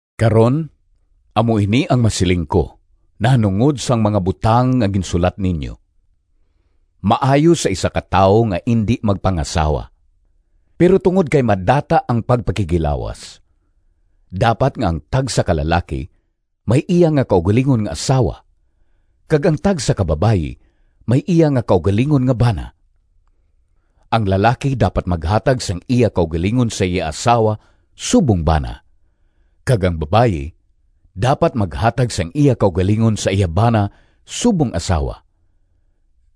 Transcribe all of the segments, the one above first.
Karon, amo ini ang masiling ko nahanungod sang mga butang nga ginsulat ninyo. Maayo sa isa ka tawo nga indi magpangasawa. Pero tungod kay madata ang pagpakighilawas, dapat nga ang tagsa ka lalaki may iya nga kaugalingon nga asawa kag ang tagsa ka babayi may iya nga kaugalingon nga bana. Ang lalaki dapat maghatag sang iya kaugalingon sa iya asawa subong bana, kag ang babayi dapat maghatag sang iya kaugalingon sa iya bana subong asawa,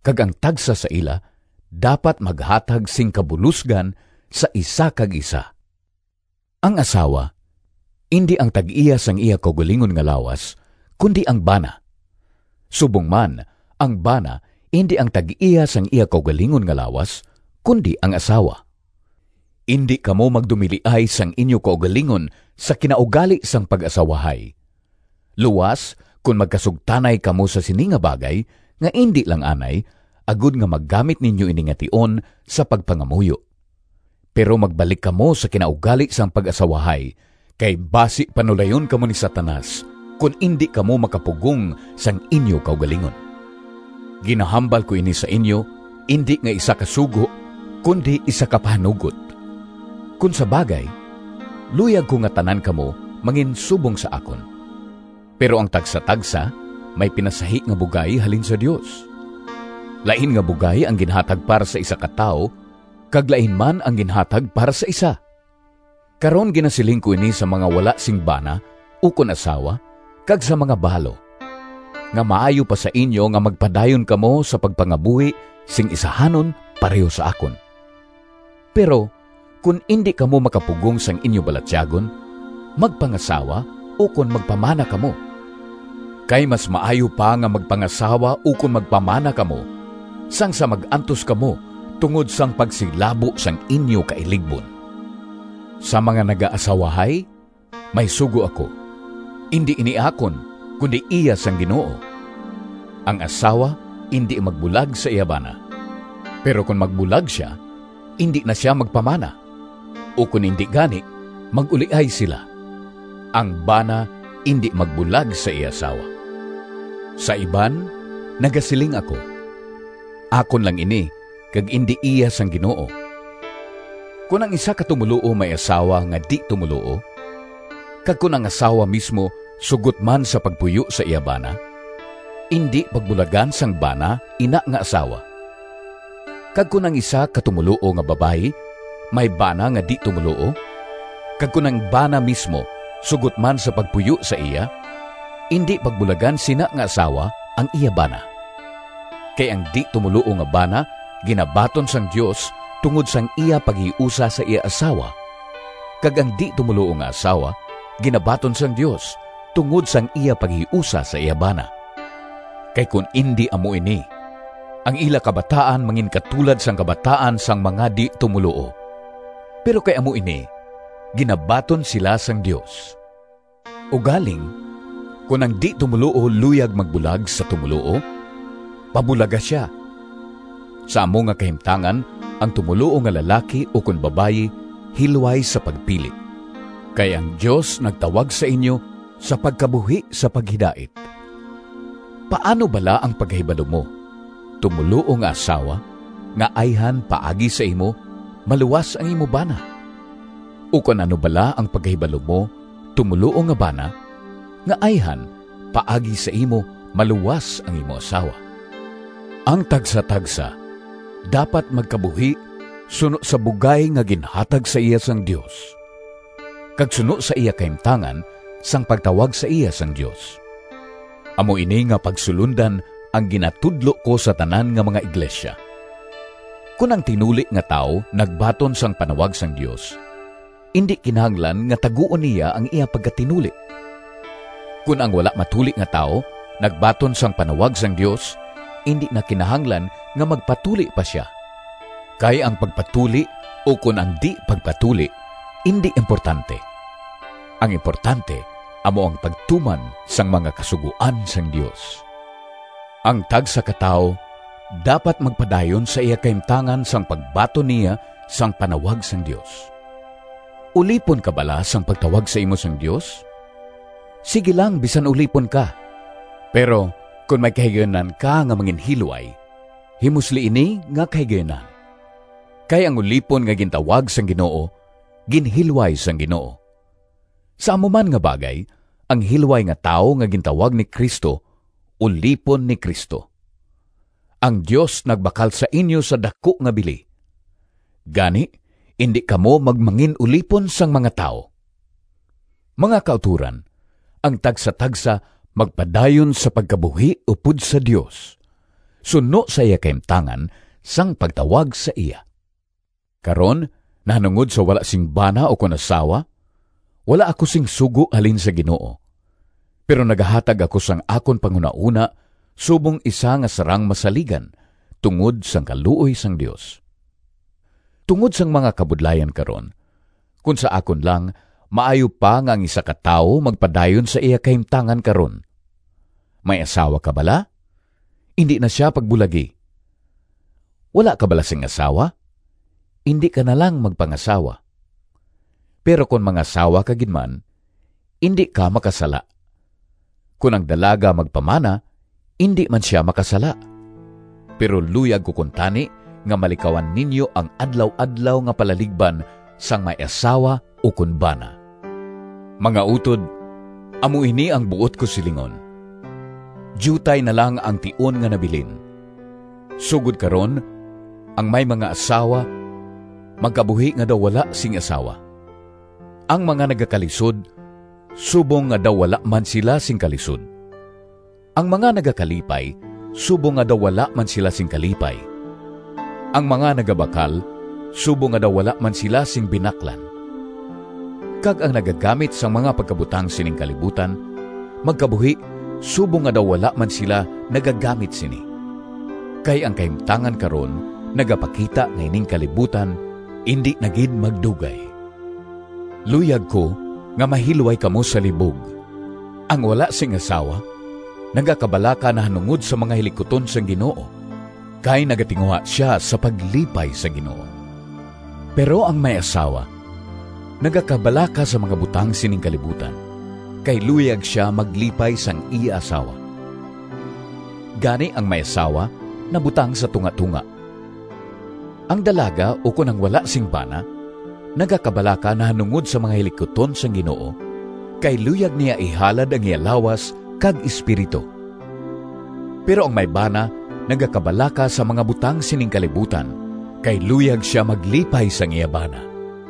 kag ang tagsa sa ila dapat maghatag sing kabulosgan sa isa kag isa. Ang asawa indi ang tag-iya sang iya kaugalingon nga lawas, kundi ang bana. Subong man, ang bana indi ang tag-iya sang iya kaugalingon nga lawas, kundi ang asawa. Indi kamo magdumiliay sang inyo kaugalingon sa kinaugali sang pag-asawahay, luas kon magkasugtanay kamo sa sini nga bagay nga indi lang anay, agod nga magamit ninyo ini nga tion sa pagpangamuyo. Pero magbalik kamo sa kinaugali sang pag-asawahay, kay basi panulayon kamo ni Satanas kon indi kamo makapugong sang inyo kaugalingon. Ginahambal ko ini sa inyo indi nga isa ka sugo, kundi isa ka pahanugot. Kon sa bagay, luyag ko nga tanan kamo manginsubong sa akon. Pero ang tagsatagsa may pinasahi nga bugay halin sa Dios. Lain nga bugay ang ginhatag para sa isa ka tawo kag lain man ang ginhatag para sa isa. Karon ginasiling ko ini sa mga wala sing bana ukon asawa, kag sa mga balo, nga maayo pa sa inyo nga magpadayon kamo sa pagpangabuhi sing isahanon pareho sa akon. Pero kon indi kamo makapugong sang inyo balatyagon magpangasawa ukon magpamana kamo. Kay mas maayo pa nga magpangasawa ukon magpamana kamo sang sa mag-antos kamo tungod sang pagsilabo sang inyo kailigbon. Sa mga nagaasawahay may sugo ako. Indi ini akon, kundi iya sang Ginoo. Ang asawa indi magbulag sa iya bana. Pero kon magbulag sia, indi na sia magpamana, ukon indi gani mag-uliay sila. Ang bana indi magbulag sa iya asawa. Sa iban nagasiling ako (akon lang ini kag indi iya sang Ginoo): kon ang isa ka tumoluo may asawa nga di-tumoluo, kag kon ang asawa mismo sugot man sa pagpuyo sa iya bana, indi pagbulagan sang bana ina nga asawa. Kag kon ang isa ka tumoluo nga babayi may bana nga di-tumoluo, kag kon ang bana mismo sugot man sa pagpuyo sa iya, indi pagbulagan sina nga asawa ang iya bana. Kay ang di-tumoluo nga bana ginabaton sang Dios tungod sang iya paghiusa sa iya asawa, kag ang di-tumoluo nga asawa ginabaton sang Dios tungod sang iya paghiusa sa iya bana. Kay kon indi amo ini, ang ila kabataan manginkatulad sang kabataan sang mga di-tumoluo. Pero kay amo ini, ginabaton sila sang Dios. Ugaling kon ang di-tumoluo luyag magbulag sa tumoluo, pabulaga sia. Sa amo nga kahimtangan ang tumoluo nga lalaki ukon babayi hilway sa pagpili. Kay ang Dios nagtawag sa inyo sa pagkabuhi sa paghidait. Paano bala ang pagkahibalo mo, tumoluo nga asawa, nga ayhan paagi sa imo maluwas ang imo bana? Ukon ano bala ang pagkahibalo mo, tumoluo nga bana, nga ayhan paagi sa imo maluwas ang imo asawa? Ang tagsatagsa dapat magkabuhi suno sa bugay nga ginhatag sa iya sang Dios, kag suno sa iya kahimtangan sang pagtawag sa iya sang Dios. Amo ini nga pagsulondan ang ginatudlo ko sa tanan nga mga iglesia. Kon ang tinuli nga tawo nagbaton sang panawag sang Dios, indi kinahanglan nga taguon niya ang iya pagkatinuli. Kon ang wala matuli nga tawo nagbaton sang panawag sang Dios, indi na kinahanglan nga magpatuli pa sia. Kay ang pagpatuli ukon ang di-pagpatuli indi importante. Ang importante amo ang pagtuman sang mga kasugoan sang Dios. Ang tagsa ka tawo dapat magpadayon sa iya kahimtangan sang pagbaton niya sang panawag sang Dios. Ulipon ka bala sang pagtawag sa imo sang Dios? Sigi lang, bisan ulipon ka, pero kon may kahigayunan ka nga manginhilway, himusli ini nga kahigayunan. Kay ang ulipon nga gintawag sang Ginoo, ginhilway sang Ginoo. Sa amo man nga bagay, ang hilway nga tawo nga gintawag ni Cristo ulipon ni Cristo. Ang Dios nagbakal sa inyo sa daku nga bili. Gani, indi kamo magmangin-ulipon sang mga tawo. Mga kautoran, ang tagsatagsa magpadayon sa pagkabuhi upod sa Dios, suno sa iya kahimtangan sang pagtawag sa iya. Karon nahanungod sa wala sing bana ukon asawa, wala ako sing sugo halin sa Ginoo, pero nagahatag ako sang akon panghunahona subong isa nga sarang masaligan tungod sang kaluoy sang Dios. Tungod sang mga kabudlayan karon, kon sa akon lang maayo pa nga ang isa ka tawo magpadayon sa iya kahimtangan karon. May asawa ka bala? Indi na sia pagbulagi. Wala ka bala sing asawa? Indi ka na lang magpangasawa. Pero kon mangasawa ka gid man, indi ka makasala. Kon ang dalaga magpamana, indi man sia makasala. Pero luyag ko kuntani nga malikawan ninyo ang adlaw-adlaw nga palaligban sang may asawa ukon bana. Mga utod, amo ini ang buot ko silingon: diutay na lang ang tion nga nabilin. Sugod karon ang may mga asawa magkabuhi nga daw wala sing asawa, ang mga nagakalisod subong nga daw wala man sila sing kalisod, ang mga nagakalipay subong nga daw wala man sila sing kalipay, ang mga nagabakal subong nga daw wala man sila sing binaklan, kag ang nagagamit sang mga pagkabutang sining kalibutan magkabuhi subong nga daw wala man sila nagagamit sini. Kay ang kahimtangan karon nagapakita nga ining kalibutan indi na gid magdugay. Luyag ko nga mahilway kamo sa libog. Ang wala sing asawa nagakabalaka nahanungod sa mga hilikuton sang Ginoo, kay nagatinguha sia sa paglipay sa Ginoo. Pero ang may asawa nagakabalaka sa mga butang sining kalibutan, kay luyag sia maglipay sang iya asawa. Gani, ang may asawa nabutang sa tungatonga. Ang dalaga ukon ang wala sing bana nagakabalaka nahanungod sa mga hilikuton sang Ginoo, kay luyag niya ihalad ang iya lawas kag espiritu. Pero ang may bana nagakabalaka sa mga butang sining kalibutan, kay luyag sia maglipay sang iya bana.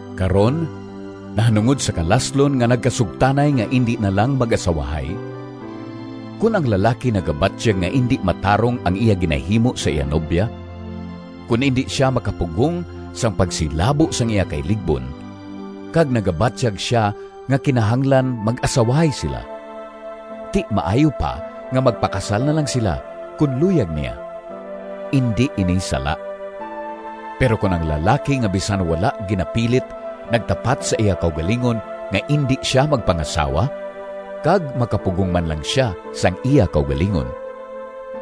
Karon, nahanungod sa kalaslon nga nagkasugtanay nga indi na lang mag-asawahay, kon ang lalaki nagabatyag nga indi matarong ang iya ginahimo sa iya nobya, kon indi sia makapugong sang pagsilabo sang iya kailigbon, kag nagabatyag sia nga kinahanglan mag-asawahay sila, ti maayo pa nga magpakasal na lang sila kon luyag niya. Indi ini sala. Pero kon ang lalaki nga bisan wala ginapilit nagtapat sa iya kaugalingon nga indi sia magpangasawa, kag makapugong man lang sia sang iya kaugalingon,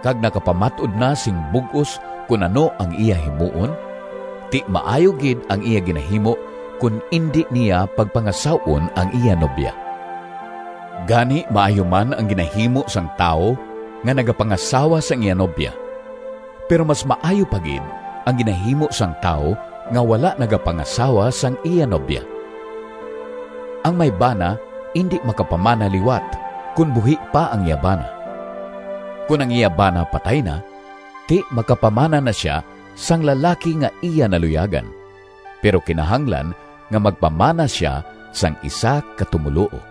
kag nakapamat-od na sing bug-os kon ano ang iya himuon, ti maayo gid ang iya ginahimo kon indi niya pagpangasaw-on ang iya nobya. Gani maayo man ang ginahimo sang tawo nga nagapangasawa sang iya nobya, pero mas maayo pa gid ang ginahimo sang tawo nga wala nagapangasawa sang iya nobya. Ang may bana indi makapamana liwat kon buhi pa ang iya bana. Kon ang iya bana patay na, ti makapamana na sia sang lalaki nga iya naluyagan, pero kinahanglan nga magpamana sia sang isa ka tumoluo.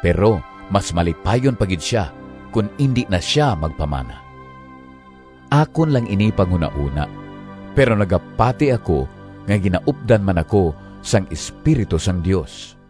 Pero mas malipayon pa gid sia kon indi na sia magpamana. Akon lang ini panghunahona, pero nagapati ako nga ginaupdan man ako sang Espiritu sang Dios.